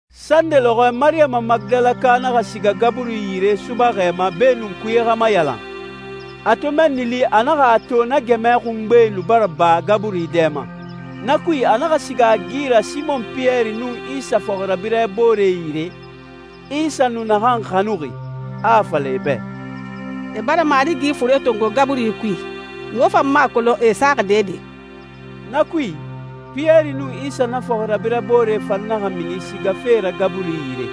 Sande lɔxɔɛ Mariyama Magidalaka naxa siga gaburi yire subaxɛ ma beenun kuye xa mayalan. A to mɛnni li, a naxa a to na gɛmɛ xungbe nu bara ba gaburi dɛ ma. Na kui, a naxa siga a gi ra Simɔn Piyɛri nun Isa fɔxirabirɛ boore yire, Isa nu naxan xanuxi, a a fala e bɛ, «E bara Marigi fure tongo gaburi kui, muxu fan mu a kolon e a saxi dɛdɛ.» Na kui, Piyɛri nun Isa na fɔxirabirɛ boore fan naxa mini sigafe ra gaburi yire.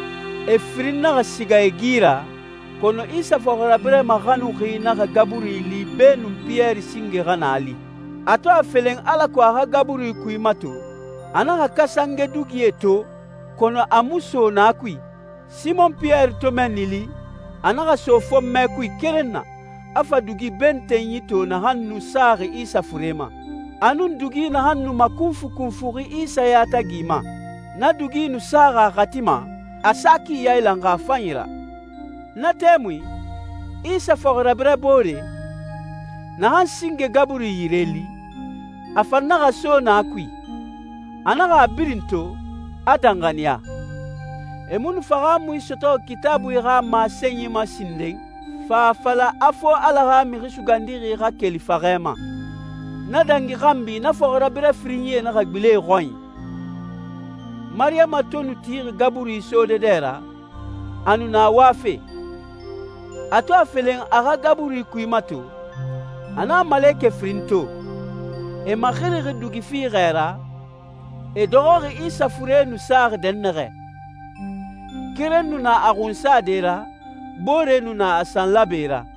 E firinyi naxa siga e gi ra, kɔnɔ Isa fɔxirabirɛ maxanuxi naxa gaburi li beenun Piyɛri singe xa naa li. A to a felen alako a xa gaburi kui mato, a naxa kasange dugie to, kɔnɔ a mu so na kui. Simɔn Piyɛri to mɛnni li, a naxa so fɔnmɛ kui keren na, a fa dugi bentenyi to naxan nu saxi Isa fure ma, a nun dugi naxan nu makunfukunfuxi Isa yatagi ma. Na dugi nu saxi a xati ma, a sa ki yailanxi a fanyi ra. Na tɛmui, Isa fɔxirabirɛ boore, naxan singe gaburi yire li, a fan naxa so na kui. A naxa a birin to, a danxaniya. E mu nu fahaamui sɔtɔxi Kitaabui xa masenyi ma sinden, fa fala a fo Ala xa Mixi Sugandixi xa keli faxɛ ma. Na dangi xanbi na fɔxirabirɛ firinyie naxa gbilen e xɔnyi. Mariyama to nu tixi gaburi sode dɛ ra, a nu na wafe. A to a felen a xa gaburi kui mato, a naxa malekɛ firin to. E maxirixi dugi fiixɛ ra, e dɔxɔxi Isa fure nu saxi dɛnnaxɛ. Keren nu na a xunsade ra, boore nu na a sanlaabe ra.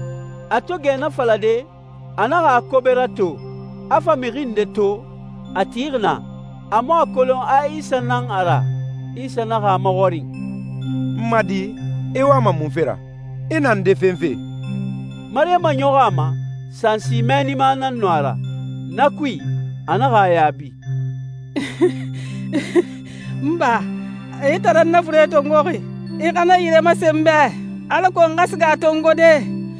A to gɛ na falade, a naxa a kobe rato, a fa mixi nde to, a tixi naa. A mu a kolon a Isa nan a ra. Isa naxa a maxɔrin, «N ma di, i wama munfe ra? I na nde fenfe?» Mariyama ɲɔxɔ a ma, sansi mɛɛnima nan nu a ra. Na kui, a naxa a yaabi, «N ba, xa i tan nan na fure tongoxi, i xa na yire masen n bɛ alako n xa siga a tongode.»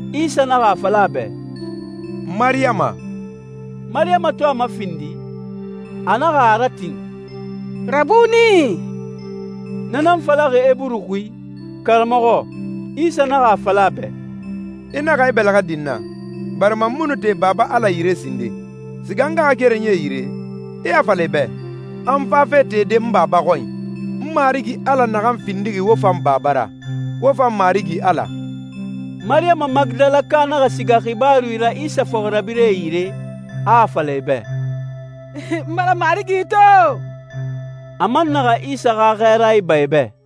Isa naxa a fala a bɛ, «Mariyama.» Mariyama to a mafindi, a naxa a ratin, «Rabuni!» Na nan falaxi Eburu xui, «Karamɔxɔ». Isa naxa a fala a bɛ, «I naxa i bɛlɛxɛ din n na, barima n mu nu te Baba Ala yire sinden. Siga n ngaxakerenyie yire, i a fala e bɛ, a n fafe tede n Baba xɔnyi, n Marigi Ala naxan findixi wo fan Baba ra, wo fan Marigi Ala.» Mariyama Magidalaka naxa siga xibaaru ra Isa fɔxirabirɛe yire, a a fala e bɛ, «N bara Marigi to!» A man naxa Isa xa xɛɛra iba e bɛ.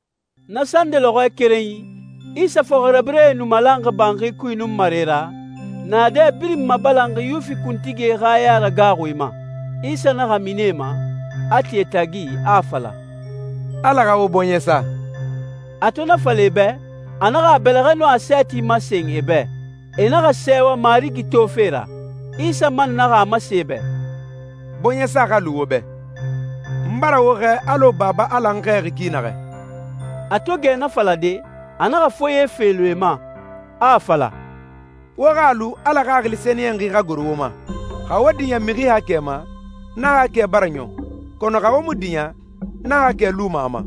Na sande lɔxɔɛ kerenyi, Isa fɔxirabirɛe nu malanxi banxi kui nunmare ra, naadɛ birin mabalanxi Yuwifi kuntigie xa yaragaaxui ma. Isa naxa mini e ma, a ti e tagi, a a fala, «Ala xa wo bɔɲɛ sa.» A to na fala e bɛ, a naxa a bɛlɛxɛe nun a sɛɛti masen e bɛ. E naxa sɛɛwa Marigi tofe ra. Isa man naxa a masen e bɛ, «Bɔɲɛsa xa lu wo bɛ. N bara wo xɛɛ alɔ Baba Ala n xɛɛxi ki naxɛ.» A to gɛ na falade, a naxa foye felun e ma, a a fala, «Wo xa lu Ala Xaxili Sɛniyɛnxi xa goro wo ma. Xa wo diɲɛ mixi haakɛ ma, na haakɛ bara ɲɔn, kɔnɔ xa wo mu diɲɛ, na haakɛ luma a ma.»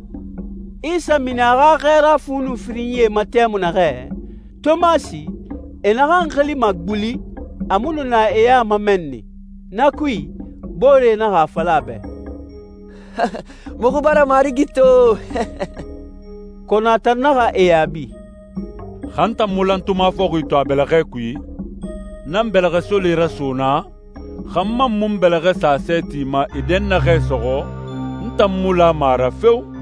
Isa mini a xa xɛɛra fu nun firinyie ma tɛmui naxɛ, Tomasi, e naxan xilima «guli», a mu nu na e ya ma mɛnni. Na kui, booree naxa a fala a bɛ, «Muxu bara Marigi to!» Kɔnɔ a tan naxa e yaabi, «Xa n tan mu lantuma fɔxi to a bɛlɛxɛ kui, n nan n bɛlɛxɛsole raso naa, xa n man mu n bɛlɛxɛ sa a sɛɛti ma e dɛnnaxɛ sɔxɔ, n tan mu lama a ra feo!»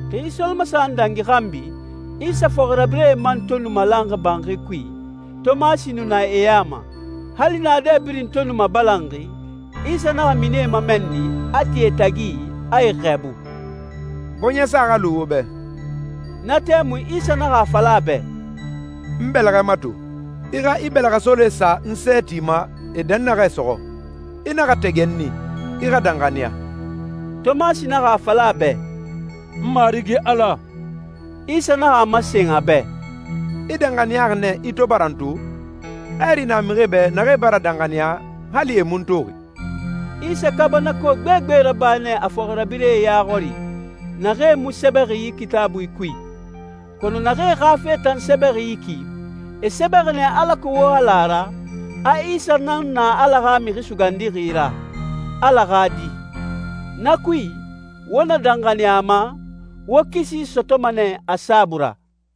Xi solomasaxan dangi xanbi, Isa fɔxirabirɛe man to nu malanxi banxi kui, Tomasi nu na e ya ma. Hali naadɛ birin to nu mabalanxi, Isa naxa mini e ma mɛnni, a ti e tagi, a e xɛɛbu, «Bɔɲɛsa xa lu wo bɛ.» Na tɛmui, Isa naxa a fala a bɛ, «N bɛlɛxɛ mato. I xa i bɛlɛxɛsole sa n sɛɛti ma e dɛnnaxɛ sɔxɔ. I naxa tɛgɛ n i. I xa danxaniya.» Tomasi naxa a fala a bɛ, «N Marigi Ala!» Isa naxa a masen a bɛ, «I danxaniyaxi nɛ, i to bara n to? Hɛɛri na mixie bɛ naxee bara danxaniya, hali e mu n toxi.» Isa kaabanako gbegbe raba nɛ a fɔxirabirɛe ya xɔri, naxee mu sɛbɛxi yi Kitaabui kui. Kɔnɔ naxee xa fe tan sɛbɛxi yi ki, e sɛbɛxi nɛ alako wo xa la a ra, a Isa nan na Ala xa Mixi Sugandixi ra, Ala xa Di. Na kui, wo na danxaniya a ma, wo kisi sɔtɔma nɛ a saabui ra.